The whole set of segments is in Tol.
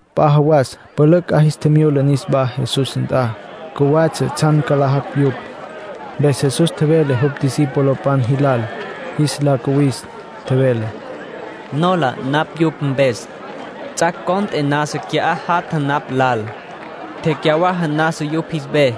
P'a jawas pülücj 'a jis tjimyula niswá Jesús nt'a. Cjuwatsja tsjan ca nlajacj yupj. Mpes Jesús tjevele jupj discipulopan jilal jis la cuwis. Tjevele: —Nola napj yupj mpes. Ts'ac' cont'e nasa qui'á jatja napj lal. Tecyawaja nasa yupj jis ve.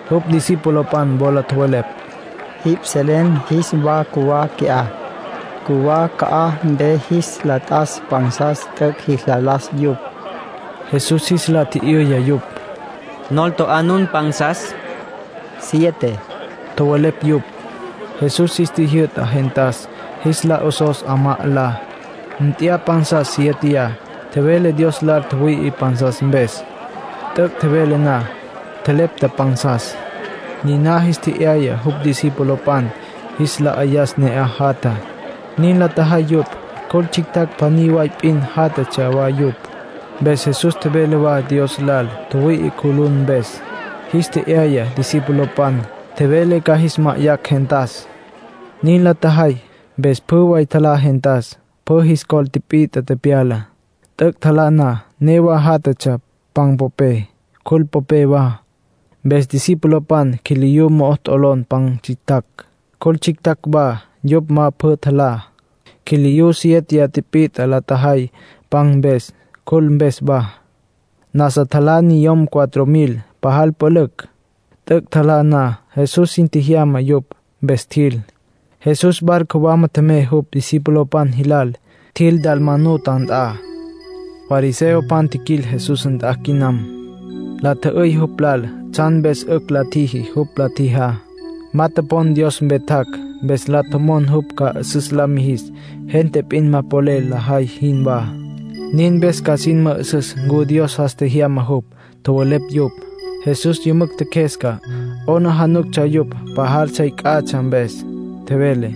Jupj discipulopan wola tjowelepj: —Jipj selen jis wa cjuwá qui'á. Cjuwá ca'aj mpe jis la t'as pansas t'üc' jis la las yupj. Jesús jis la tji'yüya yupj: —¿Nol to'á nun pansas? —Siete —tjowelepj yupj. Jesús jis tjijyü'ta gentas jis la 'osos 'amá 'alá. Nt'ya pansas sieteyá. Tjevele Dios lal tjüwüi'i pansas mpes. T'üc' tjevele na, tjelepta pansas. Niná jis tje'yaya jupj discipulopan jis la 'ayas ne'aj jatjá. Nin la tjajay yupj. Cjul tsjictjacj pjaní way p'in játjatsja wa yupj. Mpes Jesús tjevele wa Dios lal tjüwüi'i cjulun mpes. Jis tje'yaya discipulopan. Tjevele ca jis ma'ayacj gentas. Nin la tjajay, mpes pjü way tjalá gentas. Pjü jis col tipit'a tepyala. T'üc' tjalá na, newa játjatsja pan popé, cjul popé wa. Mpes discipulopan quiliyú mo'o t'olon pan tsjictjacj, cjul tsjictjacj wa, yupj ma pjü tjalá. Quiliyú siéteya tipit'a la tjajay pan mpes, cjul mpes wa. Nasa tjalá niyom cuatro mil, pajal pülücj. T'üc' tjalá na, Jesús sin tjejyama yupj, mpes tjil. Jesús barco wama tjemey jupj discipulopan jilal. Tjil Dalmanuta nt'a. Fariseopan tjiquil Jesús nt'a quinam. La tjü'üy jupj lal tsjan mpes 'ücj la tjiji jupj la tjijá. Ma topon Dios mpe tjac', mpes la tjomon jupj ca 'üsüs la mijis, gente p'in ma polel lajay jinwá. Nin mpes ca sin mü'üsüs ncu Dios jas tjejyama jupj, tjowelepj yupj. Jesús yümücj tjeqjuesca, 'aplijílatsja yupj pajal sey c'atsja mpes. Tjevele: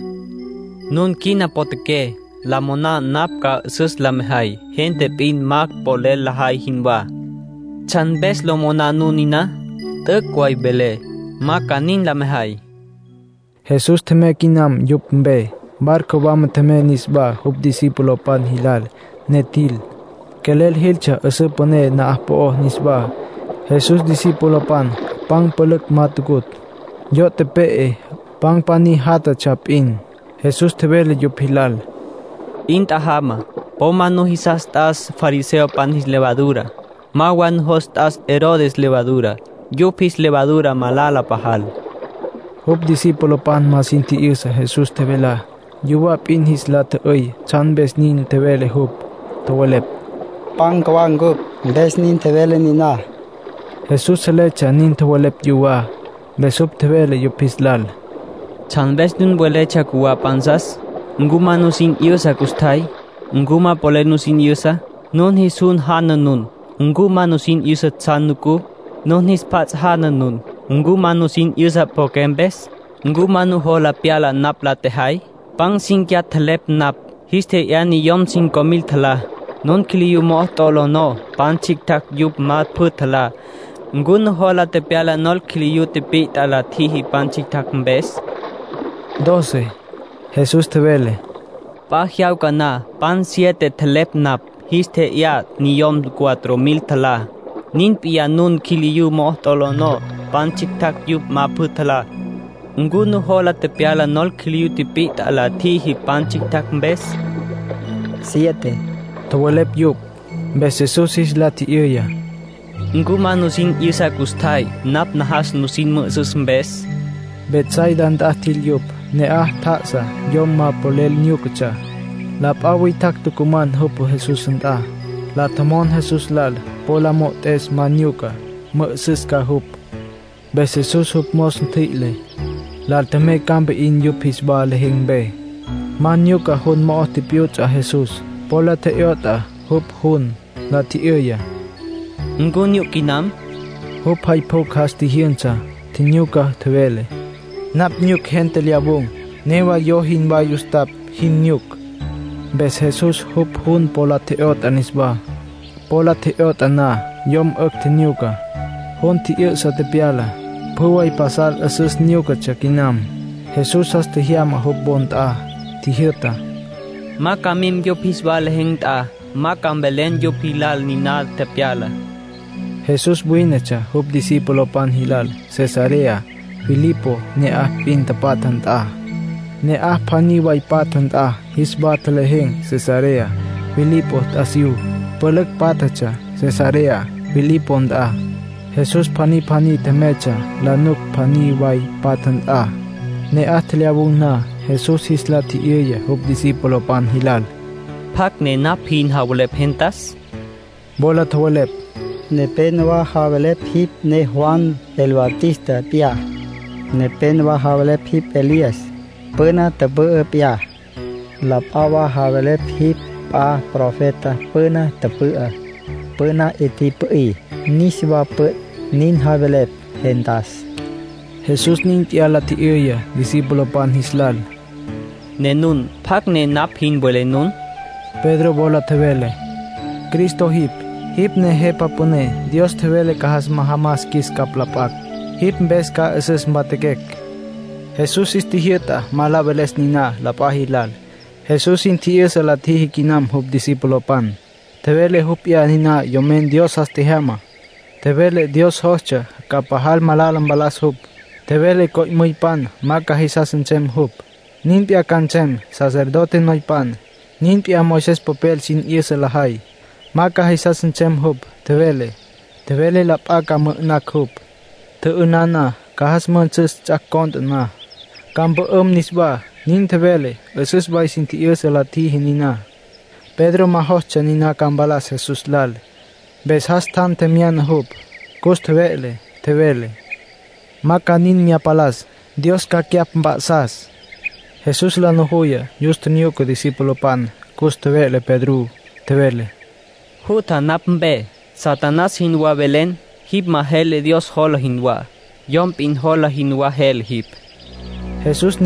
“Nun quina potjaqué, lo moná napj ca 'üsüs la mejay, gente p'in ma polel lajay jinwá. ¿Tsjan mpes lo moná nun niná? T'üc' way velé, ma ca nin la mejay.” Jesús tjemey quinam yupj mpe. Barco wama tjemey niswá jupj discipulopan jilal, ne tjil. Quelel jiltsja 'üsǘ püné na'aj po'ó niswá. Jesús discipulopan pan pülücj ma tucutj. Yo' tepe'e. Pan pjaní jatatsja p'in. Jesús tjevele yupj jilal: —'In tjajama. Po ma nujos t'as fariseopan jis levadura. Ma wa nujos t'as Herodes levadura. Yupj jis levadura malala pajal. Jupj discipulopan ma sin tji'yüsa Jesús tjevelá. Yuwá p'in jis la tjü'üy tsjan mpes nin tjevele jupj. Tjowelepj: “Pan cjuwá cupj, mpes nin tjevele niná”. Jesús seletsja nin tjowelepj yuwá. Mpes jupj tjevele yupj jis lal: —¿Tsjan mpes nun weletsja cjuwá pansas? ¿Ncu ma nusin 'yüsa custjay? ¿Ncu ma polel nusin 'yüsa? Nun jis jun janapj nun. ¿Ncu ma nusin 'yüsa tsjan nucú? Nun jis pjats' janapj nun. ¿Ncu ma sin 'yüsa pjo'oqué mpes? ¿Ncu ma nujola pyala napj la tjejay? Pan cínquiya tjelepj napj, jis tje'yá niyom cinco mil tjalá. Nun quiliyú mo'o t'olonó pan tsjictjacj yupj ma pjü tjalá. ¿Ncu nujola tepyala nol quiliyú tipit'a la tjüjí pan tsjictjacj mpes? —Doce —tjowelepj yupj. Jesús tjevele: —P'a jyawca na pan siete tjelepj napj, jis tje'yá niyom cuatro mil tjalá. Nin p'iyá nun quiliyú mo'o t'olonó pan tsjictjacj yupj ma pjü tjalá. ¿Ncu nujola tepyala nol quiliyú tipit'a la tjüjí pan tsjictjacj mpes? —Siete —tjowelepj yupj. Mpes Jesús jis la tji'yüya: —¿Ncu ma nusin 'yüsa custjay, napj najas nusin mü'üsüs mpes? Betsaida nt'a tjil yupj. Ne'aj tjá'asa yom ma polel nyúcatsja; la p'a witjacj tucuman jupj Jesús nt'a. La tjomon Jesús lal po la mo'ot'es ma nyucá, mü'ü'süs ca jupj. Mpes Jesús jupj mos ntjüi'le, lal tjemey campa 'in yupj jis wa lejen̈ mpe. Ma nyuca jun mo'o tipyuts'a Jesús, po la tje'yot'a jupj jun. La tji'yüya: —¿Ncu nyuc quinam? Jupj jay pjucj jas tjijyünsa, tjinyuca, tjevele: —Napj nyuc gente lyawun̈. Newa yo jinwá yustapj jin nyuc. Mpes Jesús jupj jun po la tje'yot'a niswá. Po la tje'yot'a na, yom 'ücj tjinyuca. Jun tji'yü'sa tepyala. Pjü way pasal 'üsüs nyúcatsja quinam. Jesús jas tjejyama jupj wo nt'a. Tjijyü'ta: —Ma ca mim yupj jis wa lejen̈ nt'a. Ma ca mvelen yupj jilal niná tepyalá. Jesús wínetsja jupj discipulopan jilal Cesarea Filipo ne'aj p'in tapatja nt'a. Ne'aj pjaní way patja nt'a jis wa tjelejen̈ Cesarea Filipo t'asiyú. Pülücj pátjatsja Cesarea Filipo nt'a. Jesús pjaní pjaní tjemeytsja la nuc pjaní way patja nt'a. Ne'aj tjelyawun̈ na, Jesús jis la tji'yüya jupj discipulopan jilal: —¿Pjacj ne napj jin javelepj gentas? Wola tjowelepj: —Nepénowa javelepj jipj ne Juan el Bautista p'iyá. Nepénowa javelepj jipj Elías, püna tüpü'ü p'iyá. La p'a wa javelepj jipj p'a profeta püna tüpü'á. Püna 'i tipü'í, niswa püt', nin javelepj gentas. Jesús nin p'iyá la tji'yüya discipulopan jis lal: —Ne nun, ¿pjacj ne napj jin welé nun? Pedro wola tjevele: —Cristo jipj. Jipj ne Jepa Püné Dios tjevele ca jas majamas qjuis capj la p'acj. Jipj mpes ca 'üsüs mpatjaquecj. Jesús jis tjijyü'ta ma la veles niná la p'a jilal. Jesús sin tji'yüsa la tjiji quinam jupj discipulopan. Tjevele jupj p'iyá niná Yomen Dios jas tjejyamá. Tjevele Dios jostsja ca pajal malala mpalas jupj. Tjevele co'müypan ma ca jisas nsem jupj. Nin p'iyá ca nsem sacerdote noypan, nin p'iyá Moisés popel sin 'yüsa lajay. Ma ca jisas nsem jupj, tjevele. Tjevele la p'a ca mü'ü'nacj jupj. Tjü'ünan na, ca jas müjünsüs ts'ac' cont'e na. Ca mpü'üm niswá, nin tjevele. 'Üsüs way sin tji'yüsa la tjiji niná. Pedro ma jostsja niná ca mpalas Jesús lal, mpes jas tjan tjemyana jupj, cus tjeve'le. Tjevele: —Ma ca nin mya mpalas. Dios ca cyapj mp'a'sas. Jesús la nujuya, yus tjinyuca discipulopan. Cus tjeve'le Pedrú, tjevele: —Jutja napj mpe. Satanás jinwá velen. Jipj ma jele Dios jola jinwá. Yom p'in jola jinwá jele jipj —nin tjevele Jesús.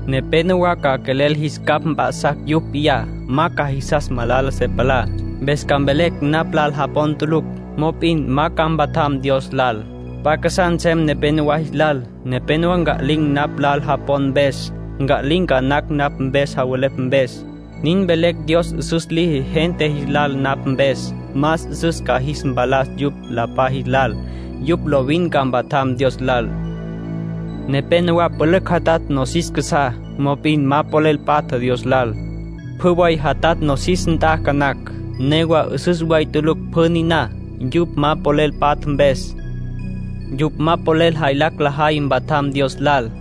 Nepénowa ca quelel jis capj mp'a'sacj yupj p'iyá. Ma ca jisas malala se palá, mpes ca mvelecj napj lal japon tulucj. Mop'in ma ca mpatjam Dios lal. P'a casá nsem nepénowa jis lal. Nepénowa nca'lin̈ napj lal japon mpes. Nca'lin̈ ca nacj napj mpes javelepj mpes. Nin mvelecj Dios 'üsüs liji gente jis lal napj mpes. Más 'üsüs ca jis mpalas yupj la p'a jis lal. Yupj lovin ca mpatjam Dios lal. ”Nepénowa pülücj jatatj nosis casá, mop'in ma polel patja Dios lal. Pjü way jatatj nosis nt'a ca nacj. Newa 'üsüs way tulucj pjü niná, yupj ma polel patja mpes. Yupj ma polel jaylacj lajay mpatjam Dios lal.